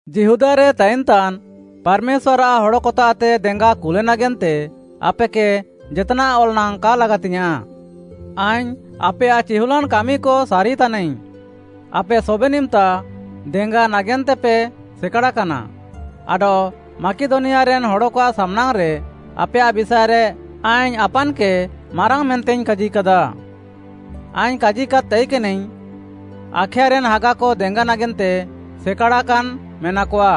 ଯିହୁଦାରେ ତାଇନ୍‌ତାନ୍ ପାର୍‌ମେଶ୍ୱାର୍‌ଆଃ ହଡ଼କତାଃତେ ଦେଙ୍ଗା କୁଲେ ନାଗେନ୍ତେ ଆପେକେ ଜେତ୍‌ନାଃ ଅଲ୍‌ ନାଙ୍ଗ୍‌ କା ଲାଗାତିଙ୍ଗ୍‌ୟାଁଃ। ଆଇଙ୍ଗ୍‌ ଆପେୟାଃ ଚିହୁଲ୍‌ଲାନ୍‌ କାମିକ ସାରିତାନାଇଙ୍ଗ୍‌, ଆପେ ସବେନ୍‌ ଇମ୍‌ତା ଦେଙ୍ଗା ନାଗେନ୍ତେପେ ସେକାଡ଼ାକାନା ଆଡଃ ମାକିଦନିଆରେନ୍‌ ହଡ଼କଆଃ ସାମ୍‌ନାଙ୍ଗ୍‌ରେ ଆପେୟାଃ ବିଷାଏରେ ଆଇଙ୍ଗ୍‌ ଆପାନ୍‌କେ ମାରାଙ୍ଗ୍‌ ମେନ୍ତେଇଙ୍ଗ୍‌ କାଜିକାଦା। ଆଇଙ୍ଗ୍‌ କାଜିକାଦ୍‌ ତାଇକେନାଇଙ୍ଗ୍‌, “ଆଖାୟାରେନ୍‌ ହାଗାକ ଦେଙ୍ଗା ନାଗେନ୍ତେ ସେକାଡ଼ାକାନ୍‌ ମେନାକଆ।”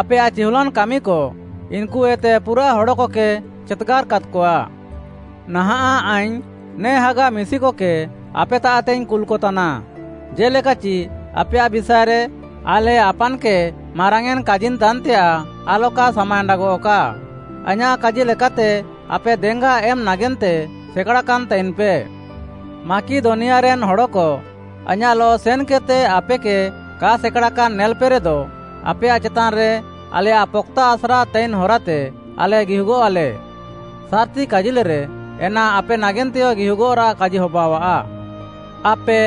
ଆପେୟାଃ ଚିହୁଲ୍‌ଲାନ୍‌ କାମିକ ଇନ୍‌କୁକଏତେ ପୁରାଃ ହଡ଼କକେ ଚେତ୍‌ଗାର୍‌ କାଦ୍‌କଆ। ନାହାଁଃ ଆଇଙ୍ଗ୍‌ ନେ ହାଗା ମିଶିକକେ ଆପେତାଃତେଇଙ୍ଗ୍‌ କୁଲ୍‌କତାନା। ଜେ'ଲେକାଚି ଆପେୟାଃ ବିଷାଏରେ ଆଲେ ଆପାନ୍‌କେ ମାରାଙ୍ଗ୍‌ୟେଁନ୍‌ କାଜିନ୍‌ତାନ୍‌ତେୟାଃ ଆଲକା ସାମାଏଣ୍ଡାଗଃକା। ଆଇଁୟାଃ କାଜି ଲେକାତେ ଆପେ ଦେଙ୍ଗା ଏମ୍‌ ନାଗେନ୍ତେ ସେକାଡ଼ାକାନ୍‌ ତାଇନ୍‌ପେ। ମାକିଦନିଆରେନ୍‌ ହଡ଼କ ଆଇଁୟାଃଲଃ ସେନ୍‌କେଦ୍‌ତେ ଆପେକେ କା ସେକାଡ଼ାକାନ୍‌ ନେଲ୍‌ପେରେଦ, ଆପେୟାଃ ଚେତାନ୍‌ରେ ଆଲେୟାଃ ପକ୍‌ତା ଆସ୍ରା ତାଇନ୍‌ ହରାତେ ଆଲେ ଗିହୁଗଃଆଲେ, ସାର୍‌ତି କାଜିଲେରେ, ଏନା ଆପେ ନାଗେନ୍ତେୟ ଗିହୁଗଃରାଃ କାଜି ହବାଅଃଆ। ଆପେ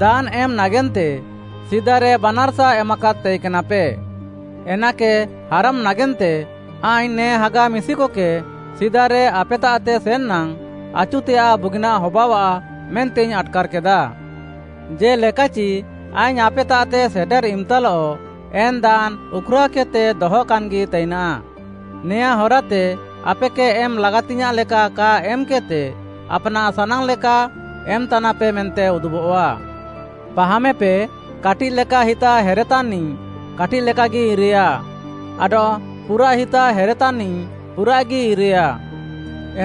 ଦାନ୍‌ ଏମ୍‌ ନାଗେନ୍ତେ ସିଦାରେ ବାନାର୍‌ସା ଏମାକାଦ୍‌ ତାଇକେନାପେ, ଏନାକେ ହାରମ୍‌ ନାଗେନ୍ତେ ଆଇଙ୍ଗ୍‌ ନେ ହାଗା ମିଶିକକେ ସିଦାରେ ଆପେତାଃତେ ସେନ୍‌ ନାଙ୍ଗ୍‌, ଆଚୁତେୟାଃ ବୁଗିନାଃ ହବାଅଃଆ ମେନ୍ତେଇଙ୍ଗ୍‌ ଆଟ୍‌କାର୍‌କେଦା। ଜେ'ଲେକାଚି ଆଇଙ୍ଗ୍‌ ଆପେତାଃତେ ସେଟେର୍‌ ଇମ୍‌ତାଲଃ ଏନ୍‌ ଦାନ୍‌ ଉଖ୍‌ରାଅକେଦ୍‌ତେ ଦହାକାନ୍‌ଗି ତାଇନା। ନେଆଁଁ ହରାତେ ଆପେକେ ଏମ୍‌ ଲାଗାତିଙ୍ଗ୍‌ୟାଁଃ ଲେକା କା ଏମ୍‌କେଦ୍‌ତେ ଆପ୍‌ନାଃ ସାନାଙ୍ଗ୍‌ ଲେକା ଏମ୍‌ତାନାପେ ମେନ୍ତେ ଉଦୁବଃଆ। ପାହାମେପେ, କାଟିଃ ଲେକା ହିତା ହେରେତାନ୍‌ନିଃ, କାଟିଃ ଲେକାଗି ଇରେୟା, ଆଡଃ ପୁରାଃ ହିତା ହେରେତାନ୍‌ନିଃ ପୁରାଃଗି ଇରେୟା।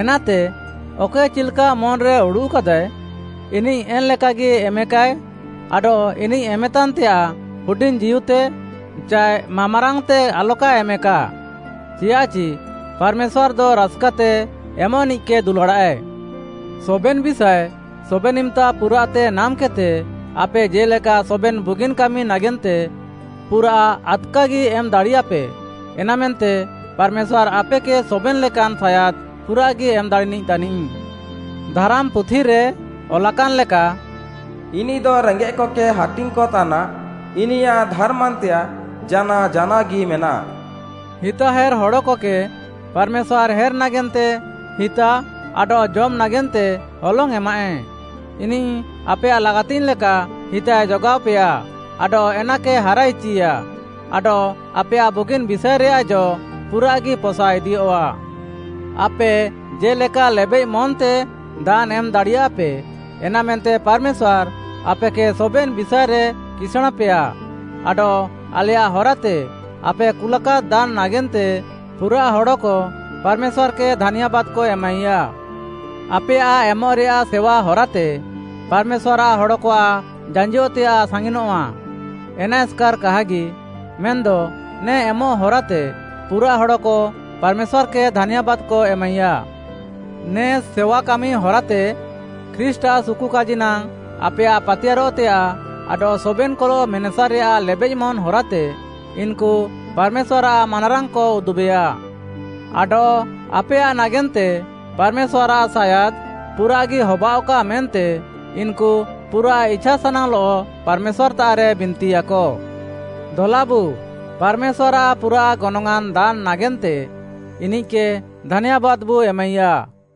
ଏନାତେ, ଅକଏ ଚିଲ୍‌କା ମନ୍‌ରେ ଉଡ଼ୁଃକାଦାଏ, ଇନିଃ ଏନ୍‌ ଲେକାଗି ଏମେକାଏ ଆଡଃ ଇନିଃ ଏମେତାନ୍‌ତେୟାଃ ହୁଡିଙ୍ଗ୍‌ଜୀଉତେ ଚାଏ ମାମ୍‌ରାଙ୍ଗ୍‌ତେ ଆଲକାଏ ଏମେକା। ଚିୟାଃଚି ପାର୍‌ମେଶ୍ୱାର୍‌ଦ ରାସ୍‌କାତେ ଏମଃନିଃକେ ଦୁଲାଡ଼ାଃଏ। ସବେନ୍‌ ବିଷାଏ ସବେନ୍‌ ଇମ୍‌ତା ପୁରାଃତେ ନାମ୍‌କେଦ୍‌ତେ, ଆପେ ଜେ'ଲେକା ସବେନ୍‌ ବୁଗିନ୍‌ କାମି ନାଗେନ୍ତେ ପୁରାଃ ଆଦ୍‌କାଗି ଏମ୍‌ ଦାଡ଼ିୟାପେ, ଏନାମେନ୍ତେ ପାର୍‌ମେଶ୍ୱାର୍‌ ଆପେକେ ସବେନ୍‌ ଲେକାନ୍‌ ସାୟାଦ୍‌ ପୁରାଃଗି ଏମ୍‌ ଦାଡ଼ିନିଃ ତାନିଃ। ଧାରାମ୍‌ ପୁଥିରେ ଅଲାକାନ୍‌ ଲେକା, “ଇନିଃଦ ରେଙ୍ଗେଃକକେ ହାଟିଙ୍ଗ୍‌କ ତାନା, ଇନିୟାଃ ଧାର୍‌ମାନ୍‌ତେୟାଃ ଜାନାଅ ଜାନାଅଗି ମେନାଃ।” ହିତାହେର୍‌ ହଡ଼କକେ ପାର୍‌ମେଶ୍ୱାର୍‌ ହେର୍‌ ନାଗେନ୍ତେ ହିତା ଆଡଃ ଜମ୍‌ ନାଗେନ୍ତେ ହଲଙ୍ଗ୍‌ ଏମାଃଏ, ଇନିଃ ଆପେୟାଃ ଲାଗାତିଙ୍ଗ୍‌ ଲେକା ହିତାଏ ଯୋଗାଅପେୟା ଆଡଃ ଏନାକେ ହାରାଇଚିୟା, ଆଡଃ ଆପେୟାଃ ବୁଗିନ୍‌ ବିଷାଏରେୟାଃ ଜ ପୁରାଃଗି ପସା ଇଦିୟଃଆ। ଆପେ ଜେ'ଲେକା ଲେବେଃମନ୍‌ତେ ଦାନ୍‌ ଏମ୍‌ ଦାଡ଼ିୟାପେ, ଏନାମେନ୍ତେ ପାର୍‌ମେଶ୍ୱାର୍‌ ଆପେକେ ସବେନ୍‌ ବିଷାଏରେ କିସାଁଣ୍‌ପେୟା ଆଡଃ ଆଲେୟାଃ ହରାତେ ଆପେ କୁଲାକାଦ୍‌ ଦାନ୍‌ ନାଗେନ୍ତେ ପୁରାଃ ହଡ଼କ ପାର୍‌ମେଶ୍ୱାର୍‌କେ ଧାନ୍ୟାବାଦ୍‌କ ଏମାଇୟା। ଆପେୟାଃ ଏମଃରେୟାଃ ସେୱା ହରାତେ ପାର୍‌ମେଶ୍ୱାର୍‌ଆଃ ହଡ଼କଆଃ ଜାଞ୍ଜିଅଃତେୟାଃ ସାଙ୍ଗିନଃଆ, ଏନା ଏସ୍‌କାର୍‌ କାହାଗି, ମେନ୍‌ଦ ନେ ଏମଃ ହରାତେ ପୁରାଃ ହଡ଼କ ପାର୍‌ମେଶ୍ୱାର୍‌କେ ଧାନ୍ୟାବାଦ୍‌କ ଏମାଇୟା। ନେ ସେୱାକାମି ହରାତେ ଖ୍ରୀଷ୍ଟ୍‌ଆଃ ସୁକୁକାଜି ନାଙ୍ଗ୍‌ ଆପେୟାଃ ପାତିୟାର୍‌ରଃତେୟାଃ ଆଡଃ ସବେନ୍‌କଲଃ ମେନେସାରେୟାଃ ଲେବେଃମନ୍‌ ହରାତେ ଇନ୍‌କୁ ପାର୍‌ମେଶ୍ୱାର୍‌ଆଃ ମାନାରାଙ୍ଗ୍‌କ ଉଦୁବେୟା। ଆଡଃ ଆପେୟାଃ ନାଗେନ୍ତେ ପାର୍‌ମେଶ୍ୱାର୍‌ଆଃ ସାୟାଦ୍‌ ପୁରାଃଗି ହବାଅଃକା ମେନ୍ତେ ଇନ୍‌କୁ ପୁରାଃ ଇଛାସାନାଙ୍ଗ୍‌ଲଃ ପାର୍‌ମେଶ୍ୱାର୍‌ତାଃରେ ବିନ୍ତିୟାକ। ଦଲାବୁ, ପାର୍‌ମେଶ୍ୱାର୍‌ଆଃ ପୁରାଃ ଗନଙ୍ଗ୍‌ଆଁନ୍‌ ଦାନ୍‌ ନାଗେନ୍ତେ, ଇନିଃକେ ଧାନ୍ୟାବାଦ୍‌ବୁ ଏମାଇୟା।